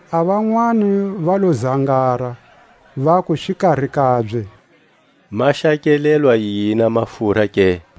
A vanwani va lo zangara, vaku xikari kabye: Ma xakelelwa yini a mafura ke?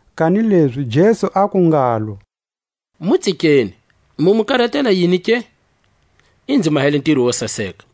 Kanilezi Jesu aku ngalo: Mu tsikeni, mu mu karatela yini ke? I nzi mahele a ntiro wo saseka.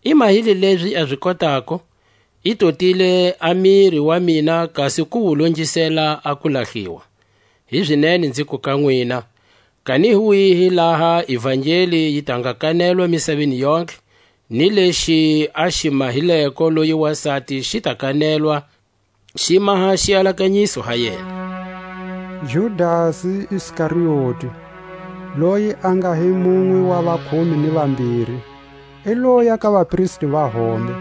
I mahile lezi a zi kotako; i totile a miri wa mina kasi ku wu longisela a ku lahliwa. Hizinene nziku ka nwina: Kani hi kwihi laha ivangeli yi ta nga kanetwa misaveni yontlhe, ni lexi a xi mahileko loyi wasati xi ta kanetwa, xi maha xialakanyiso ha yena. Judasi Iskarioti, loyi a nga hi munwe wa vakhume ni vambiri, i loya ka vapristi va hombe,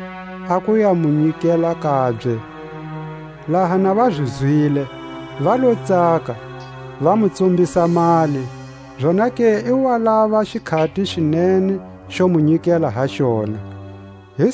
a ku ya mu nyikela kabye. Laha na va zi zwile, va lo tsaka, va mu tsumbisa mali; zonake i wa lava xikhati xi nene xo mu nyikela ha xona. A Pasika.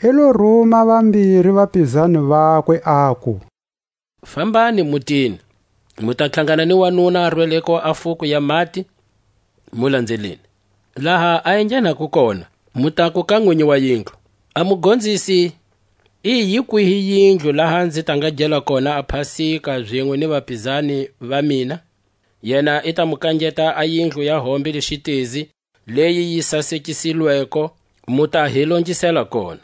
I lo ruma vambiri va vapizani vakwe, aku: Fambani mutini, mu ta tlhangana ni wanuna a rweleko a fuko ya mati; mu lanzeleni. Laha a enghenako kona, mu taku ka nwinyi wa yindlu: A Mugonzisi i, yi kwihi yindlu laha nzi ta nga gela kona a pasika zinwe ni vapizani va mina? Yena i ta mu kangeta a yindlu ya hombe le xitezi, leyi yi sasekisilweko; mu ta hi longisela kona.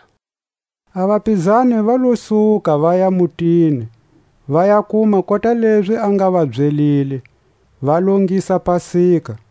A vapizani va lo suka, vaya mutini, va ya kuma kota lezi a nga va byelile; va longisa pasika.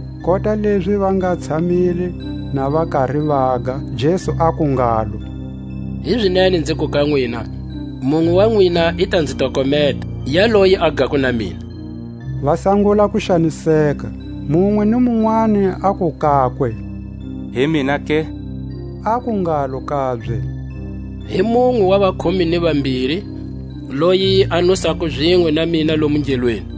Kota lezi va nga tshamile na va kari vaga, Jesu aku ngalo: Hizinene nziku ka nwina: Munwe wa nwina i ta nzi tokometa, yaloyi a gako na mina. Va sangula ku xaniseka, munwe ni munwani aku kakwe: Hi mina ke? Aku ngalo kabye: Hi munwe wa vakhume ni vambiri, loyi a nusako zinwe na mina lomu ngelweni.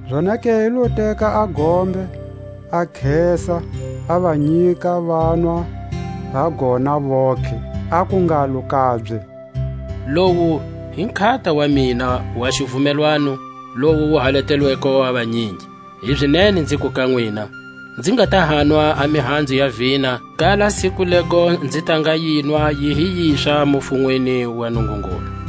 Zonake i lo teka a gombe, a khesa, a va nyika, vanwa ha gona vontlhe. Aku ngalo kabye: Lowu hi nkhata wa mina wa xivumelwano, lowu wu halatelweko a vanyingi. Hizinene nziku ka nwina: Nzi nga ta hanwa a mihanzu ya vina, kala siku lego nzi ta nga yinwa yi hi yiswa mufunweni wa Nungungulu.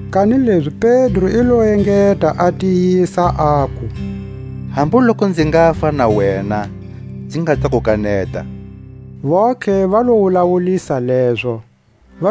Kanilezi Pedro i lo engeta, a tiyisa aku: Hambu lokunzi ngafa na wena, nzi nga ta ku kaneta. Vontlhe va lo wulawulisa lezo. Getsemane.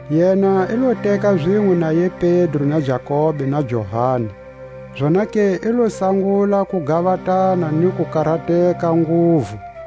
Yena i lo teka zinwe naye Pedro na Jakobe na Johani, zonake i lo sangula ku gavatana ni ku karateka nguvu.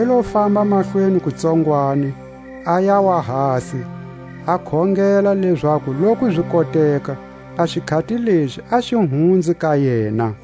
I lo famba mahlweni kutsongwani, a yawa hasi, a khongela lezaku loku zi koteka, a xikhati lexi a xi hunze ka yena.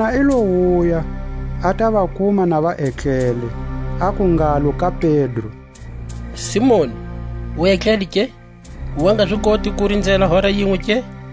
Yena i lo wuya, a ta va kuma na va etlele, aku ngalo ka Pedro: Simoni, u etlele, ke? U wa nga zi koti ku rinzela hora yinwe ke?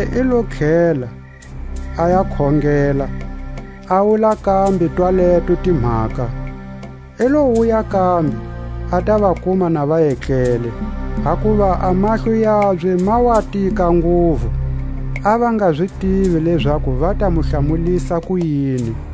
Zonake i lo tlhela, a ya khongela, a wula kambe twaleto timhaka. I lo wuya kambe, a ta va kuma na va etlele, hakuva a mahlo yabye ma wa tika nguvu; a va nga zi tivi lezaku va ta mu hlamulisa kuyini.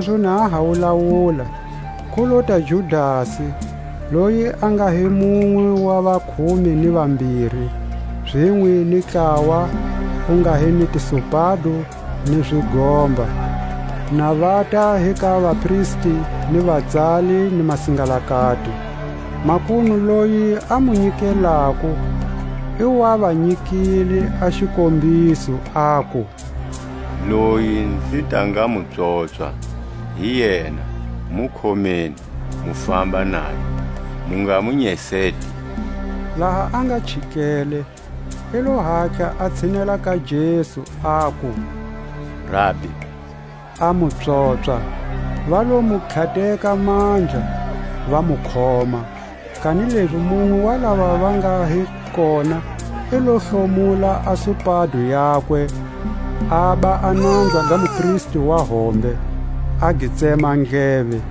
Zalezo na a ha wulawula, ku lota Judasi, loyi a nga hi munwe wa vakhume ni vambiri, zinwe ni ntlawa wu nga hi ni tisupado ni zigomba, na vata hi ka vapristi ni vatsali ni masingalakati. Makunu loyi a mu nyikelako i wa va nyikile a xikombiso, aku: Loyi nzi ta nga mu pswopswa, hi yena; mu khomeni, mu famba naye, mu nga mu nyeseti. Laha a nga chikele, i lo hatla a tshinela ka Jesu, aku: Rabi; a mu pswopswa. Va lo mu tlhateka mandla, va mu khoma. Kanilezi munwe wa lava va nga hi kona i lo hlomula a supado yakwe, aba a nanza ga mupristi wa hombe, a gi tsema ndleve.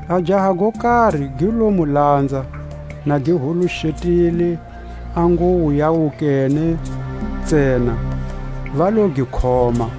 A jaha go kari gi lo mu lanza, na gi huluxetile a nguwo ya wukene ntsena; va lo gi khoma,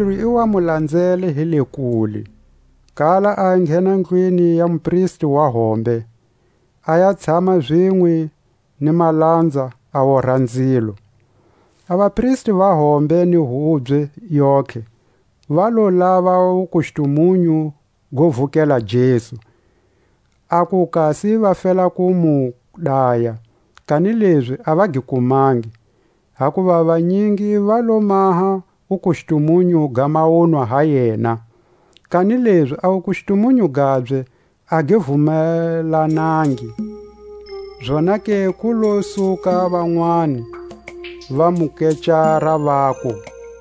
Pedro i wa mu lanzele hi le kule; kala a enghena ndlwini ya mupristi wa hombe, a ya tshama zinwe ni malanza, a wora nzilo. A vapristi va hombe ni hubye yontlhe va lo lava wukustumunyu go vukela Jesu, aku kasi va fela ku mu daya; kanilezi a va gi kumangi. Hakuva vanyingi va lo maha wukustumunyu ga mawunwa ha yena, kanilezi a wukustumunyu gabye a gi vumelanangi. Zonake ku lo suka vanwani, va mu kecara, vaku: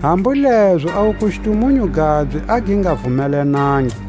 Hambu lezo a wukustumunyu gabye a gi nga vumelanangi.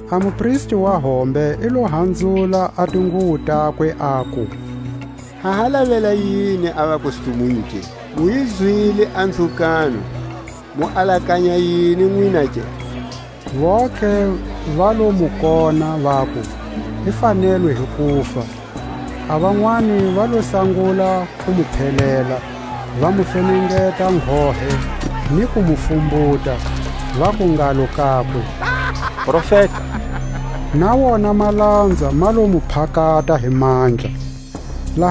A mupristi wa hombe i lo hanzula a, tinguwo takwe, aku: Ha ha lavela yini a vakustumunyu ke? Mu yi zwile a nzhukano; mu alakanya yini nwina ke? Vontlhe va lo mu kona, vaku: I fanelwe hi kufa. A vanwani va lo sangula ku mu phelela, va mu fenengeta nghohe, ni ku mu fumbuta, vaku ngalo kakwe: Profeta! Na wona malanza ma lo mu phakata hi mandla. Pedro a kaneta Hosi yakwe.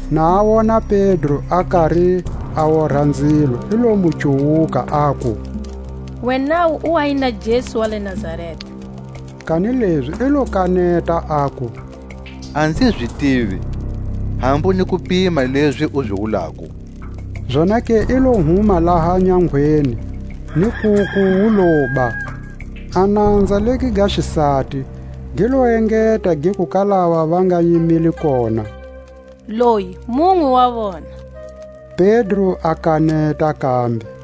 na a wona Pedro a kari a wora nzilo, i lo mu cuwuka, aku: Wenawu u wa hi na Jesu wa le Nazareta. Kanilezi i lo kaneta, aku: A nzi zi tivi, hambu ni ku pima lezi u zi wulako. Zonake i lo huma laha nyangweni, ni nkuku wu loba. A nanza legi ga xisati, gi lo engeta giku ka lava va nga yimile kona: Loyi munwe wa wona. Pedro a kaneta kambe.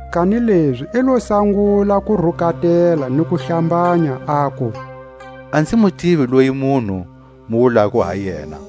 Kanilezi i lo sangula ku rukatela ni ku hlambanya, aku: A nzi mu tivi loyi munhu, mu wulako ha yena.